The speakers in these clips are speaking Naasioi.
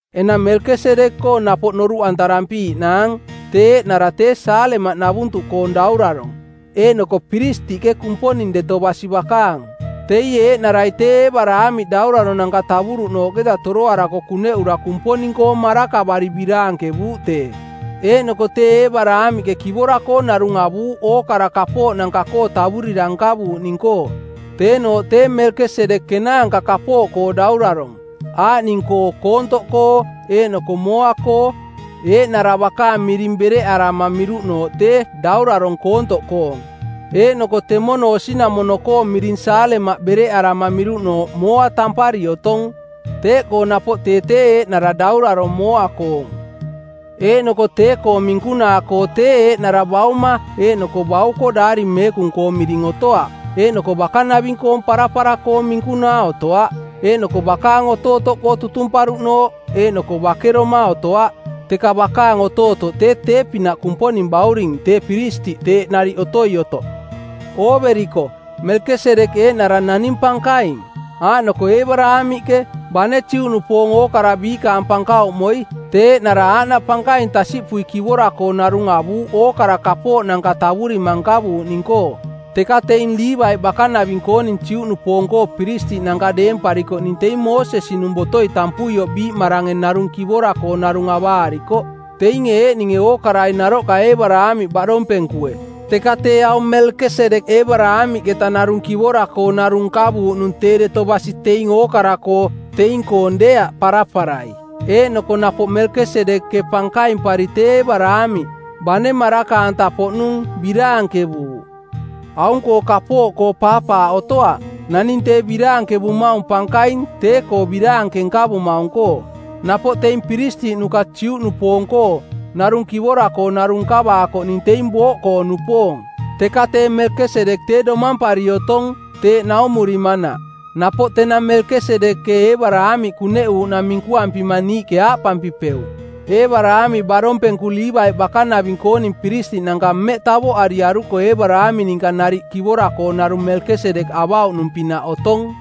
Enang Melkesedek-koo napoꞌ noruꞌantarampiiꞌnaang. Tee eeꞌnara tee Saalemaꞌnavuntuꞌkoong daurarong˜, eeꞌnoko piristiꞌke Kumponing deto basi bakaang. Teie eeꞌnarai tee Eebaraamiꞌ dauraronanka tavuruꞌnooꞌketa toroarako kuneꞌura Kumponing-koo marakavari biraankevuuꞌ tee. Eeꞌnoko tee Eebaraamiꞌke kivora-koo narung avuuꞌ ookara kapooꞌnanka-koo tavurira nkavuuꞌning-koo. Teenooꞌ tee Melkesedek kenaanka kapooꞌkoo daurarong, aaꞌning-koo koontoꞌkoo eeꞌnoko mooa-koo. Eeꞌnara bakaang miring bereꞌarama miruꞌnooꞌ tee “Daurarong Koontoꞌkoong”, eeꞌnoko temono osinamono-koong miring Saalemaꞌ bereꞌarama miruꞌnooꞌ “Mooa” tampari otong. Teeꞌkoo napoꞌ tee tee eeꞌnara daurarong mooa-koong. Eeꞌnoko tee-koong minkunaa-koo tee eeꞌnara bauma eeꞌnoko bauko Daari Meekung-koo miring otoaꞌ eeꞌnoko bakanaving-koong parapara-koong minkunaa otoaꞌ, eeꞌnoko bakaang otootoꞌkoo tutumparuꞌnooꞌ eeꞌnoko bakeroma otoaꞌ, teka bakaang otootoꞌ tee tee-pinaꞌ Kumponing Bauring tee piristiꞌ teeꞌ nariꞌ otoi otoꞌ. Ooveriko, Melkesedek eeꞌnara naning pankaing. Aaꞌnoko Eebaraamiꞌke, bane Juꞌnupoong ookara biikaang pankauꞌmoi, tee eeꞌnara aaꞌnaꞌ pankaing tasiꞌpui kivora-koo narung avuuꞌ ookara kapooꞌnanka tavurima nkavuuꞌning-koo. Teka teing Liivaiꞌ bakanaving-kooning Juꞌnupoong-koo piristiꞌnanka deemparikoꞌning teing Moosesi-nung botoi tampuioꞌ biiꞌmarange narung kivora-koo narung avaarikoꞌ, teinge eeꞌninge ookarai naroꞌka Eebaraamiꞌ baꞌdompenkue. Teka tee aung Melkesedek Eebaraamiꞌketa narung kivora-koo narung nkavuuꞌnung tee deto basi teing ookara-koo, teing-koong deeaꞌ paraparai. Eeꞌnoko napoꞌ Melkesedek-ke pankaimpari tee Eebaraamiꞌ, bane maraka-anta-poꞌnung, biraankevuuꞌ. Aung-koo kapooꞌkoo paapaaꞌ otoaꞌ, naning tee biraankevumaung pankaing tee-koo biraanke nkavumaung-koo. Napoꞌ teing piristiꞌnuka Juꞌnupoong-koo, narung kivora-koo narung nkavaakoꞌning teing booꞌkoo-nupoong, teka tee Melkesedek tee domampari otong, teeꞌ naumurimanaꞌ. Napoꞌ tenang Melkesedek-ke Eebaraamiꞌ kuneꞌuuꞌnang minkuampima niiꞌke aaꞌpampipeuꞌ: Eebaraamiꞌ baꞌdompenku Liivaiꞌ bakanaving-kooning piristiꞌnanka mmeꞌ tavoꞌariaruko Eebaraamiꞌ ninka nariꞌ kivora-koo narung Melkesedek avauꞌnung-pinaꞌ otong.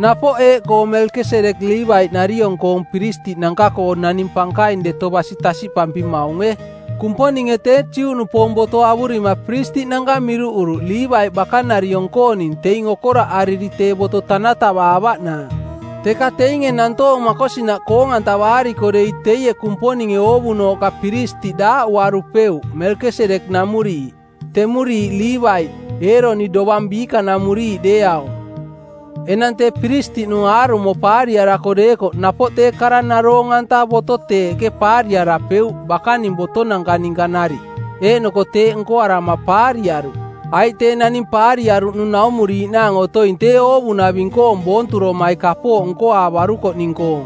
Napoꞌ eeꞌkoo Melkesedek Liivaiꞌnariong-koong piristiꞌnanka-koo naning pankaing deto basi tasiꞌpampimaunge: Kumponinge tee Juꞌnupoong boto avurima piristiꞌnanka miruꞌuruꞌ Liivaiꞌ bakanariong-kooning teing okoraꞌariri tee boto tanatavaavaꞌnaang. Teka teinge nantoong makosinaꞌ naroong-antavaariko dei teie Kumponinge oovunooꞌka piristiꞌ daaꞌuarupeuꞌ Melkesedek-namuriiꞌ, temuriiꞌ Liivaiꞌ, Eeroni dovang biikanamuriiꞌ deeaung. Enang tee piristiꞌnung aarumo paariarako deekoꞌ napoꞌ tee kara naroong-anta boto teeꞌke paariarapeuꞌ bakaning botonanka ninka nariꞌ, eeꞌnoko teeꞌ nkoarama paariaruꞌ. Aiꞌ tee naning paariaruꞌnung naumuriiꞌnaang otoing tee oovunaving-koong boonturomai kapooꞌ nkoaavarukoꞌning-koong.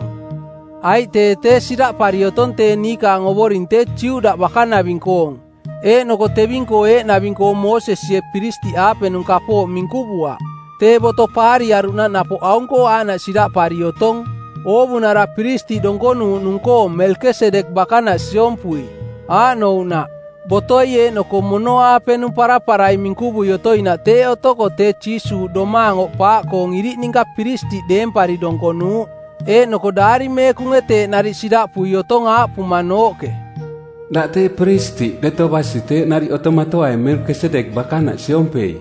Aiꞌ tee tee siraꞌpari otong tee niikaang Ovoring tee Juda bakanaving-koong eeꞌnoko teving-koo eeꞌnaving-koo Moosesie piristiꞌaapenung kapooꞌ minkuvuaꞌ. Tee boto paariaruꞌnaꞌ napoꞌ aung-koo aaꞌnaꞌ siraꞌpari otong: oovunara piristiꞌ donkonuuꞌnung-koo Melkesedek bakanaꞌ siompui. Aaꞌnouꞌnaꞌ: Botoi eeꞌnoko mono-aapenung paraparai minkuvui otoinaꞌ teeꞌ otoko tee Jiisuuꞌ domaang oꞌpaaꞌkoong iriꞌ ninka piristiꞌ deempari donkonuuꞌ. Eeꞌnoko Daari Meekunge teeꞌ nariꞌ siraꞌpui otong aaꞌpumanooꞌke, “Daꞌ tee piristiꞌ deto basi teeꞌ nariꞌ otomatoaing Melkesedek bakanaꞌ siompei.”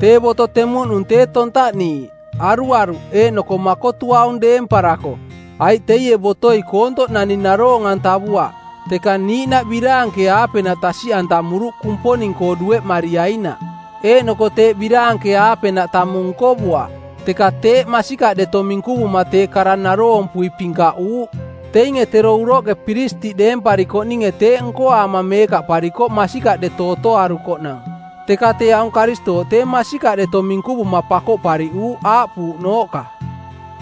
Tee boto temuꞌnung tee tontaꞌniiꞌ, aruaruꞌ eeꞌnoko makotuaung deemparako, aiꞌ teie botoi koontoꞌ naning naroong-antavuaꞌ. Teka niiꞌnaꞌ biraanke-aapenaꞌ tasiꞌantamuruꞌ Kumponing-koo dueꞌmariainaꞌ. Eeꞌnoko teeꞌ biraanke-aapenaꞌ tamung nkovuaꞌ, teka teeꞌ masikaꞌ deto minkuvuma tee kara naroompui pinkaꞌuuꞌ. Teinge tero uroꞌke piristiꞌ deemparikoꞌninge teeꞌ nkoaama meekaꞌparikoꞌ masikaꞌ deto otoarukoꞌnang, teka tee aung Karistooꞌ tee masikaꞌ deto minkuvuma pakoꞌpariꞌuuꞌ aaꞌpuuꞌnooꞌka,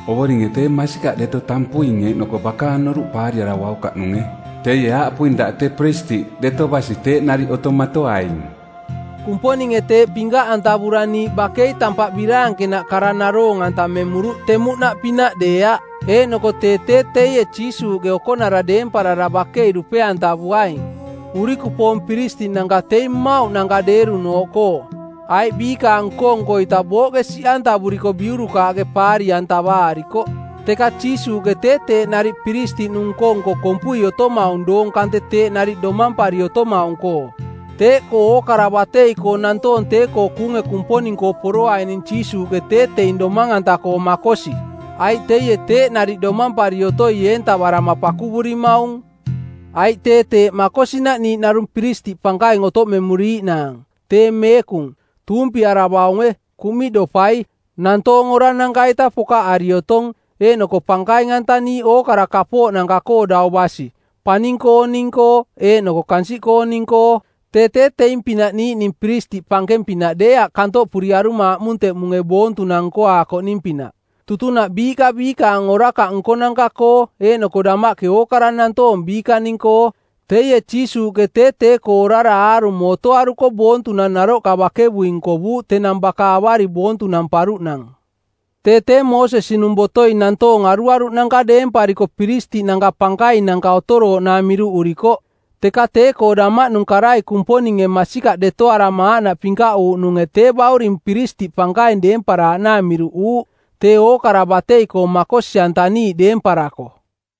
“Ovoringe tee masikaꞌ deto tampuing eeꞌnoko bakaang noruꞌ paariaravaukaꞌnunge. Teie aaꞌpuing: Daꞌ tee piristiꞌ deto basi teeꞌ nariꞌ otomatoaing.” Kumponinge teeꞌ pinkaꞌantavura niiꞌ bakei tampaꞌ biraankenaꞌ kara naroong-antamemuruꞌ temuꞌnaꞌpinaꞌ deeaꞌ, eeꞌnoko tee tee teie Jiisuuꞌke okonara deemparara bakei dupe-antavuaing. Urikupoong piristiꞌnanka teing mmauꞌnanka deerunooꞌkoo, aiꞌ biikaang nko-nko-ita booꞌke siꞌantavuriko biurukaaꞌke paari-antavaarikoꞌ. Teka Jiisuuꞌke tee teeꞌ nariꞌ piristiꞌnung nko-nko kompui otomaung doong kante teeꞌ nariꞌ domampari otomaung-koo. Teeꞌkoo ookara batei-koo nantoong tee-koo kuunge Kumponing-koo poroaining Jiisuuꞌke tee teing domang-anta-koo makosi, aiꞌ teie teeꞌ nariꞌ domampari otoi eentavarama pakuvurimaung. Aiꞌ tee teeꞌ makosinaꞌ niiꞌ narung piristiꞌ pankaing otoꞌmemuriiꞌnaang, tee meekung, tuumpiaravaunge, kuꞌmiꞌdopai, nantoong orananka-ita pokaꞌari otong, eeꞌnoko pankaing-antaniiꞌ ookara kapooꞌnanka-koo dau basi, paning-kooning-koo eeꞌnoko kansiꞌkooning-koo. Tee tee teing-pinaꞌ niiꞌning piristiꞌ pankeng-pinaꞌ deeaꞌ kantoꞌpuriaruma aꞌmunteꞌmunge boontunang nkoaakoꞌning-pinaꞌ tutunaꞌ biiꞌka biikaang orakaꞌ nkonanka-koo eeꞌnoko damaꞌke ookara nantoong biikaning-koo. Teie Jiisuuꞌke tee tee-koo orara aarumo otoaruko boontunang naroꞌka bakevui nkovuuꞌ tenang baka avari boontunamparuꞌnang. Tee tee Moosesi-nung botoi nantoong aruaruꞌnanka deempariko piristiꞌnanka pankainanka otorooꞌnaang miruꞌurikoꞌ, teka tee-koo damaꞌnung karai Kumponinge masikaꞌ detoarama aaꞌnaꞌ pinkaꞌuuꞌnunge tee Bauring piristiꞌ pankaing deemparaaꞌnaang miruꞌuuꞌ, tee ookara batei-koo makosi-antaniiꞌ deemparako.